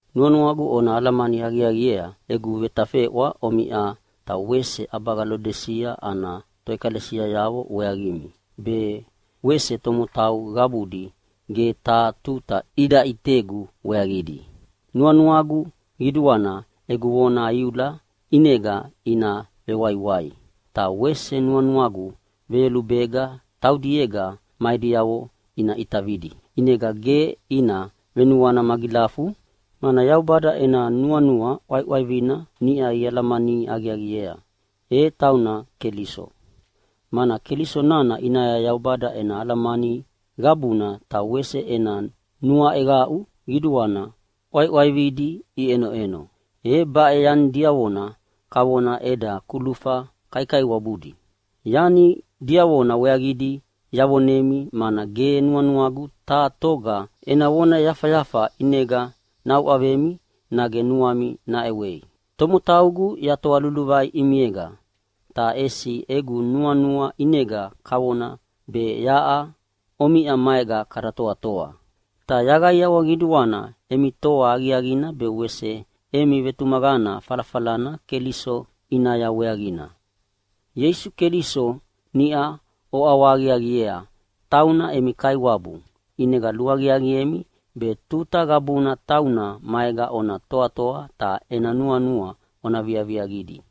Nuanuagu ona alamani aqiaqiea egu vetafeʼwa omiʼa ta wese ʼabaga Lodisia ana toʼekalesiayavo weaqimi, be wese tomotau qabudi ge taha tuta ida ʼitegu weaqidi. Nuanuagu qiduana egu vona iula ʼinega ina vewaiwai, ta wese nuanuagu veyolubega taudiega ma ediavo ina ʼitavidi. ʼInega ge ina venuana magilafu, mana Yaubada ena nuanua ʼwaiʼwaivina niʼa ialamani aqiaqiea, e tauna Keliso. Mana Keliso nana ʼinaya Yaubada ena alamani qabuna ta wese ena nuaʼeqaʼu qiduana ʼwaiʼwaividi iʼenoʼeno. E baʼe yani diavona kavona eda kulufa kaikaiwabudi. Yani diavona weaqidi yavonemi mana ge nuanuagu taha toga ena vona yafayafa ʼinega nauʼavemi nage nuami naʼewei. Tomotaugu yatoa luluvai ʼimiega, ta ʼesi egu nuanua ʼinega kavona be yaʼa omiʼa maega kada toatoa. Ta yaqaiawa qiduana emi toa aqiaqina be wese emi vetumaqana falafalana Keliso ʼinaya weaqina. Ieisu Keliso niʼa oʼawahaqiaqiea tauna emi Kaiwabu, ʼinega luaqiaqiemi be tuta qabuna tauna maega ona toatoa ta ena nuanua ona viaviaqidi.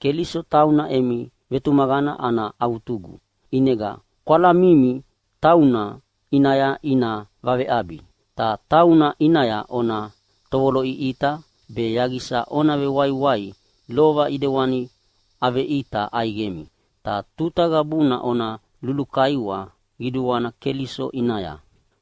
Keliso tauna emi vetumaqana ana avutugu. ʼInega kwalamimi tauna ʼinaya ina vaveʼabi. Ta tauna ʼinaya ona tovoloʼiʼita be yaqisa ona vewaiwai lova ʼidewani aveʼita ʼaiqemi. Ta tuta qabuna ona lulukaiwa qiduana Keliso ʼinaya.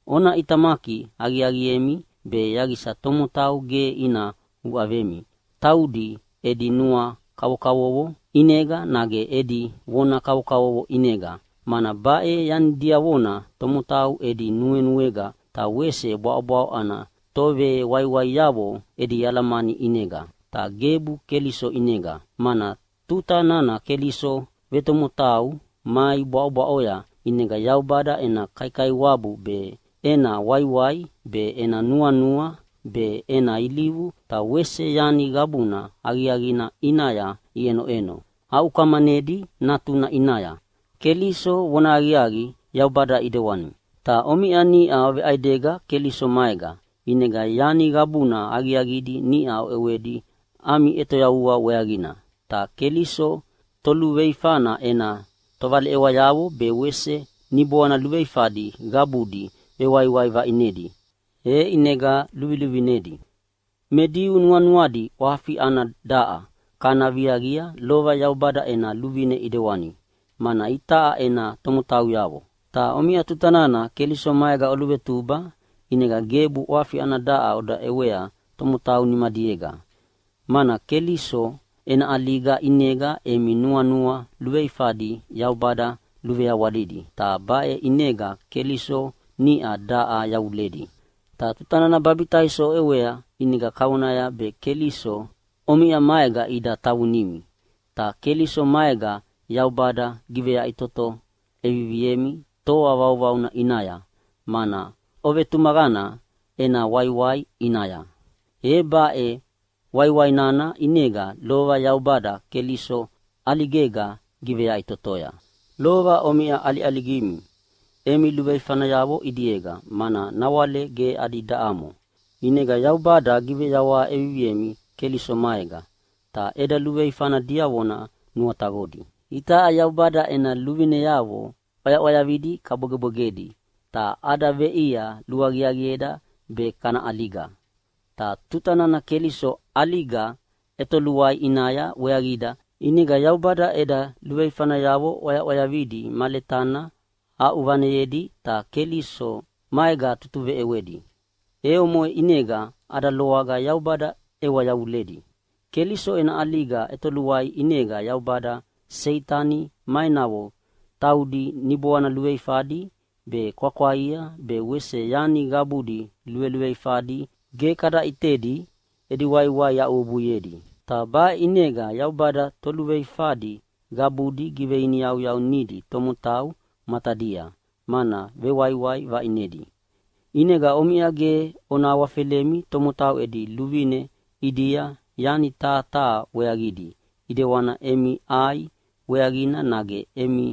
Ona ʼitamaki aqiaqiemi be yaqisa tomotau ge ina uʼavemi taudi edi nuanua kavokavovo ʼinega nage edi vona kavokavovo ʼinega, mana baʼe yani diavona tomotau edi nuenuega ta wese bwaʼobwaʼo ana tovewaiwaiavo edi alamani ʼinega, ta gebu Keliso ʼinega. Mana tuta nana Keliso vetomotau mai bwaʼobwaʼoya ʼinega Yaubada ena kaikaiwabu be, ena waiwai be, ena nuanua be, ena ilivu ta wese yani qabuna aqiaqina ʼinaya iʼenoʼeno aʼukamanedi Natuna ʼinaya. Keliso vonahaqiaqi Yaubada ʼidewani. Ta omiʼa niʼa oveʼaidega Keliso maega, ʼinega yani qabuna aqiaqidi niʼa oʼewedi ami ʼetoyavua weaqina. Ta Keliso toluveifana ena tovaleʼewayavo be wese niboana luveifadi qabudi vewaiwai vaʼinedi, e ʼinega luviluvinedi. Me Diu nuanuadi ʼwafi ana daʼa kana viaqia lova Yaubada ena luvine ʼidewani, mana itaʼa ena tomotauyavo. Ta omiʼa tuta nana Keliso maega oluvetuba ʼinega gebu ʼwafi ana daʼa oda ʼewea tomotau nimadiega, mana Keliso ena ʼaliga ʼinega emi nuanua luveifadi Yaubada luveawalidi, ta baʼe ʼinega Keliso niʼa daʼa yavuledi. Ta tuta nana babitaiso oʼewea ʼinega kavonaya be Keliso omiʼa maega ida tavunimi. Ta Keliso maega Yaubada giveyaʼitoto ʼeviviemi toa vauvauna ʼinaya, mana ovetumaqana ena waiwai ʼinaya. E baʼe waiwai nana ʼinega lova Yaubada Keliso ʼaligega giveyaʼitotoya. Lova omiʼa ʼaliʼaligimi emi luveifanayavo ʼidiega, mana nawale ge adi daʼamo. ʼInega Yaubada giveyawaha ʼeviviemi Keliso maega, ta eda luveifana diavona nuataqodi. Itaʼa Yaubada ena luvineavo ʼwayaʼwayavidi kabwegebwegedi, ta ada veʼia luaqiaqieda be kana ʼaliga. Ta tuta nana Keliso ʼaliga ʼetoluai ʼinaya weaqida, ʼinega Yaubada eda luveifanayavo ʼwayaʼwayavidi ma letana aʼuvaneyedi ta Keliso maega tutuveʼewedi, e omoʼe ʼinega ada loaga Yaubada ʼewa yavuledi. Keliso ena ʼaliga ʼetoluaia ʼinega Yaubada Seitani ma enavo taudi niboana luveifadi be, kwakwaia be wese yani qabudi luveluveifadi ge kada ʼitedi edi waiwai aʼuwebuiedi. Ta baʼe ʼinega Yaubada toluveifadi qabudi giveiniyauyaunidi tomotau matadia, mana vewaiwai vaʼinedi. ʼInega omiʼa ge ona awafelemi tomotau edi luvine ʼidia yani taha taha weaqidi ʼidewani emi ʼai weaqina nage emi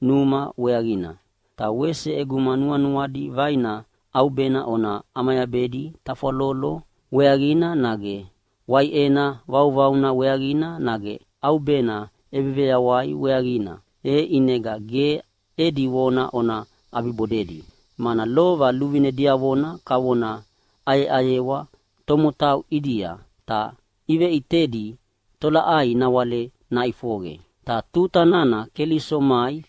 numa weaqina. Ta wese ʼeguma nuanuadi vaina ʼaubena ona ʼamayabedi tafwalolo weaqina nage waiʼena vauvauna weaqina nage ʼaubena ʼebeveyawai weaqina, e ʼinega ge edi vona ona ʼabibodedi. Mana lova luvine diavona kavona ʼayeʼayewa tomotau ʼidia, ta iveʼitedi tolaʼai nawale naʼifoqe. Ta tuta nana Keliso mai,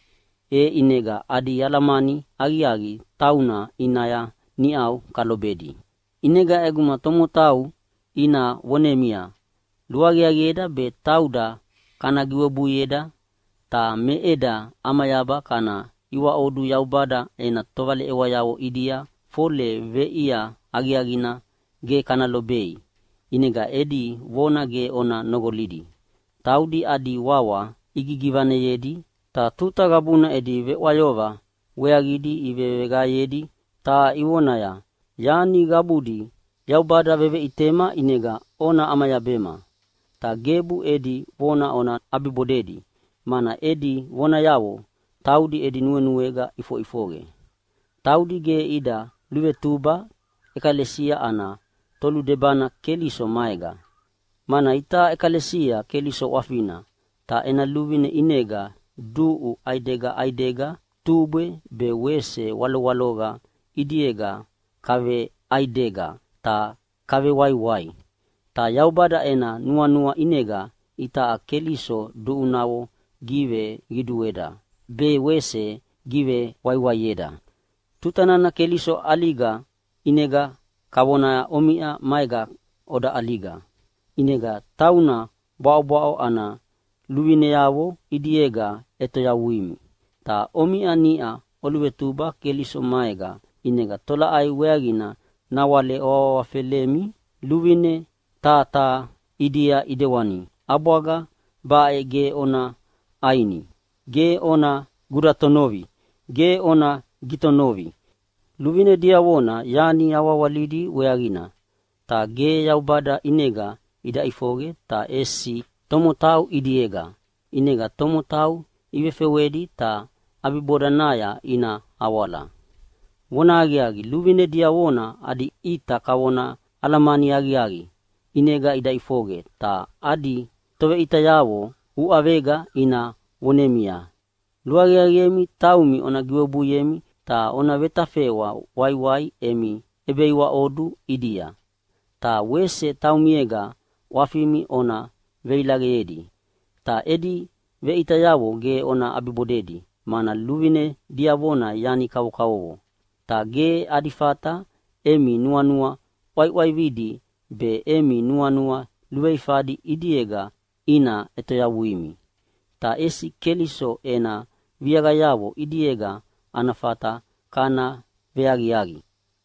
e ʼinega adi alamani aqiaqi tauna ʼinaya niʼau kalobedi. ʼInega ʼeguma tomotau ina vonemia, “Luaqiaqieda be tauda kana giwebuieda ta me eda ʼamayaba kana iwaʼodu Yaubada ena tovaleʼewayavo ʼidia, fole veʼia aqiaqina ge kana lobei.” ʼInega edi vona ge ona noqolidi. Taudi adi wawa igigivaneyedi, ta tuta qabuna edi veʼwayoqa weaqidi iveveqaeyedi ta ivonaya, “Yani qabudi Yaubada veveʼitema ʼinega ona ʼamayabema.” Ta gebu edi vona ona ʼabibodei, mana edi vonayavo taudi edi nuenuega ʼifoʼifoqe. Taudi ge ida luvetuba ʼekalesia ana toludebana Keliso maega. Mana itaʼa ʼekalesia Keliso ʼwafina, ta ena luvine ʼinega duʼu ʼaidega ʼaidega tubwe be wese walowaloqa ʼidiega kaveʼaidega ta kavewaiwai. Ta Yaubada ena nuanua ʼinega itaʼa Keliso duʼunavo giveqidueda be wese givewaiwaieda. Tuta nana Keliso ʼaliga ʼinega kavona omiʼa maega oda ʼaliga. ʼInega tauna bwaʼobwaʼo ana luvineavo ʼidiega ʼetoyavuimi. Ta omiʼa niʼa oluvetuba Keliso maega, ʼinega tolaʼai weaqina nawale oawahawafelemi luvine taha taha ʼidia ʼidewani, “ʼAbwaga baʼe ge ona ʼaini! Ge ona gudatonovi! Ge ona gitonovi!” Luvine diavona yani awahawalidi weaqina, ta ge Yaubada ʼinega ida ʼifoqe ta ʼesi tomotau ʼidiega, ʼinega tomotau ivefewedi ta ʼabibodanaya ina awala. Vonahaqiaqi, luvine diavona adi ʼita kavona alamani aqiaqi ʼinega ida ʼifoqe. Ta adi toveʼitayavo uʼavega ina vonemia, “Luaqiaqiemi taumi ona giwebuiemi ta ona vetafeʼwa waiwai emi ʼebeiwaʼodu ʼidia, ta wese taumiega ʼwafimi ona veilaqeyedi.” Ta edi veʼitayavo ge ona ʼabibodei, mana luvine diavona yani kavokavovo, ta ge adi fata emi nuanua ʼwaiʼwaividi be emi nuanua luveifadi ʼidiega ina ʼetoyavuimi. Ta ʼesi Keliso ena viaqayavo ʼidiega ana fata kana veaqiaqi.